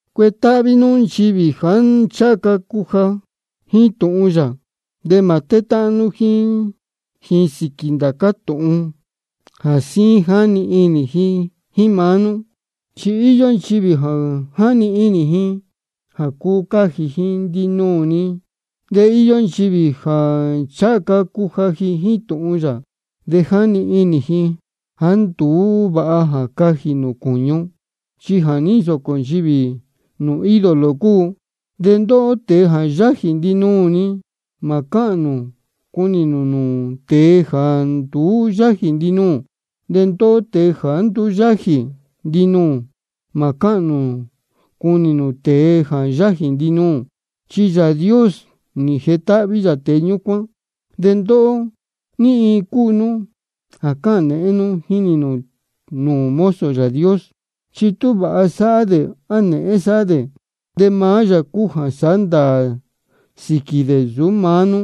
Cuetáhví nú nchivī jāá ncháha ca cuja jíín tūhun yā, de mā tétáhán nú jíín ji sīquī ndācá tūhun jā síín jáni inī ji jíín maá nú. Chi íyó nchivī jā jáni inī ji jā cuu cajī ji ndinuū-ni. De íyó nchivī jāá ncháha ca cuja jíín tūhun yā, de jáni inī ji jāá nduú vāha jā cajī ji cūñu, chi jā ní nsōcō nchivī nūū ídolo cúu. De ndóhó tēe jā yájī ndinuū-ni, mā cáhān nū cunī nū tēe jāá nduú yájī ndinuū. De ndóhó tēe jāá nduú yájī ndinuū, mā cáhān nū cunī nū tēe jā yájī ndinuū. Chi Yāā Dios nī jetáhví yā tēe ñúcuán. De ndóhó, ¿ní iin cúu nú jā cáhān nēhén nú jínī nū mozo Yāā Dios? Chi tú vāha sáhá dē á nēhén sáhá dē, de maá yā cúu jā sáhá ndāā sīquī dē, nsūú maá nú.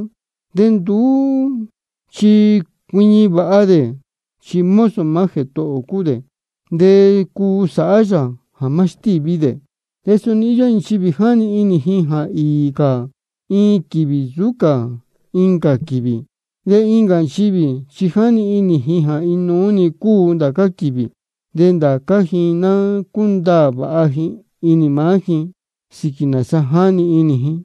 De nduú chi cuiñi vāha dē, chi mozo maá Jētohō ō cúu dē, de cuu sāhá yā jā má stíví dē. De suni íyó nchivī jā jáni inī jā īī cā iin quīvī nsūú cā incā quīvī. De incā nchivī chi jáni inī ji jā inuú-ni cúu ndācá quīvī. De ndācá ji ná cúndaā vāha inī maá ji sīquī nāsa jáni inī ji.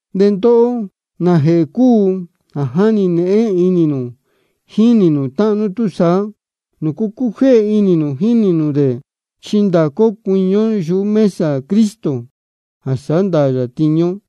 De ndóhó, ¿nājēhē cúu jā jáni nēhén inī nū jínī nū táhán nú túsaá? ¿De nūcu cújéhe inī nū jínī nū dē? Chi ndācá ó cuiñi ó yuhú mesa Cristo jā sāhá ndāā yā tiñu ó.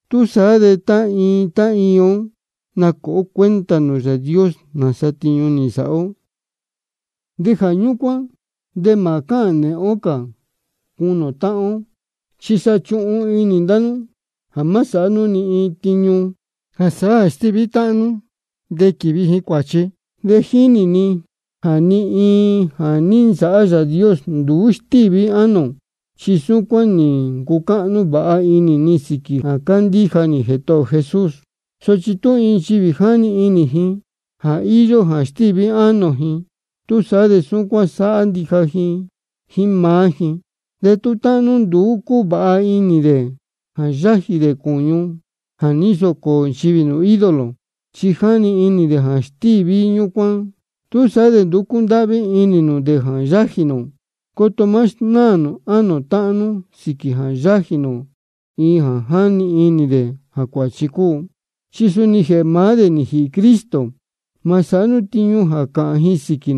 Túsaá de tá iin tá iin ó nacuāha ó cuenta nūū Yāā Dios nāsa tiñu nī nsāhá ó. De jā ñúcuán de mā cáhān nēhén cā ō cunī ō táhán ó. Chi sa chuhun inī ndá nú jā má sāhá nú ni iin tiñu jā sāhá jā stíví táhán nú de quīvi ji cuāchi. De jínī ni jā ni iin jā ní nsāhá Yāā Dios, nduú stíví ánō ō. Chi súcuán nī ncucáhnú vāha inī ni sīquī jā cándíja nī Jētohō ō Jesús. Sochi tú iin nchivī jáni inī ji jā íyó jā stíví ánō ji, túsaá de súcuán sáhá ndija jíín maá ji. De tú táhán nú nduú cúvāha inī dē jā yájī nū cūñu jā ní nsōcō nchivī nūū ídolo, chi jáni inī dē jā stíví ñúcuán ánō nū, túsaá de nduú cúndáhví inī nū dē jā yájī nū. Coto má snáā nū ánō táhán nú sīquī jā yájī nū iin jā jáni inī dē jā cuāchi cúu. Chi suni jēhē maá dē nī jīhī Cristo. Mā sāhá nú tiñu jā cāhān ji sīquī,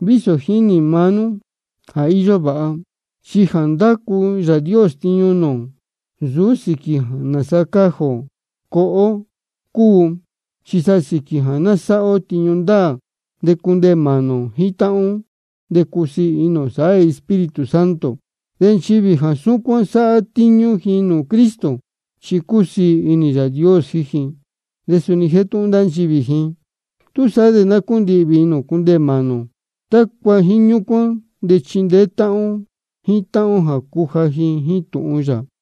vísō jínī maá nú jā íyó vāha. Chi jā ndácu Yāā Dios tiñu nūū ō, nsūú sīquī nāsa cajī ō coho ó cúu, chi sa sīquī jā ná sáhá ó tiñu ndāā, de cundeē mānī ō jíín táhán ó, de cusiī inī ō sāhá Espíritu Santo. De nchivī jā súcuán sáhá tiñu jā cúnī Cristo, chi cúsiī inī Yāā Dios jíín ji, de suni jétúhún ndá nchivī ji. Túsaá de ná cúndihvī inī ō cundeē mānī ō, tácua jíín ñúcuán de chindeé táhán ó jíín táhán ó jā cuja ó jíín tūhun yā.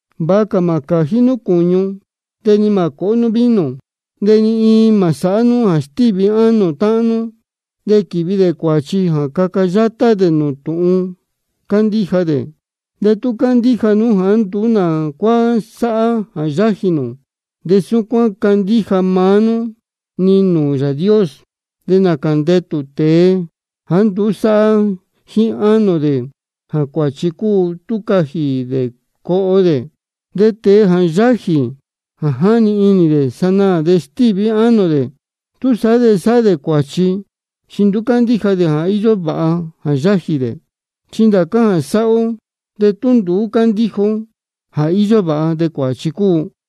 Vāha cā mā cājí nú cūñu, ni mā cōhó nú vino, de ni iin mā sāhá nú jā stíví ánō táhán nú, de quīvi dē cuāchi, de caca yátá dē nūū tūhun cándíja dē. De tú cándíja nú jāá nduú nā cuá sáhá jā yájī nū, de súcuán candíja maá nú-ni nūū Yāā Dios. De nācā ndetū tēe jāá nduú sáhá jíín ánō dē jā cuāchi cúu tú cajī dē coho dē. De tēe jā yáji iin jā jáni inī dē sanaā de stíví ánō dē, túsaá de sáhá dē cuāchi, chi nduú cándíja dē jā íyó vāha jā yájī dē. Chi ndācá jā sáhá ó, de tú nduú cándíja ó jā íyó vāha, de cuāchi cúu.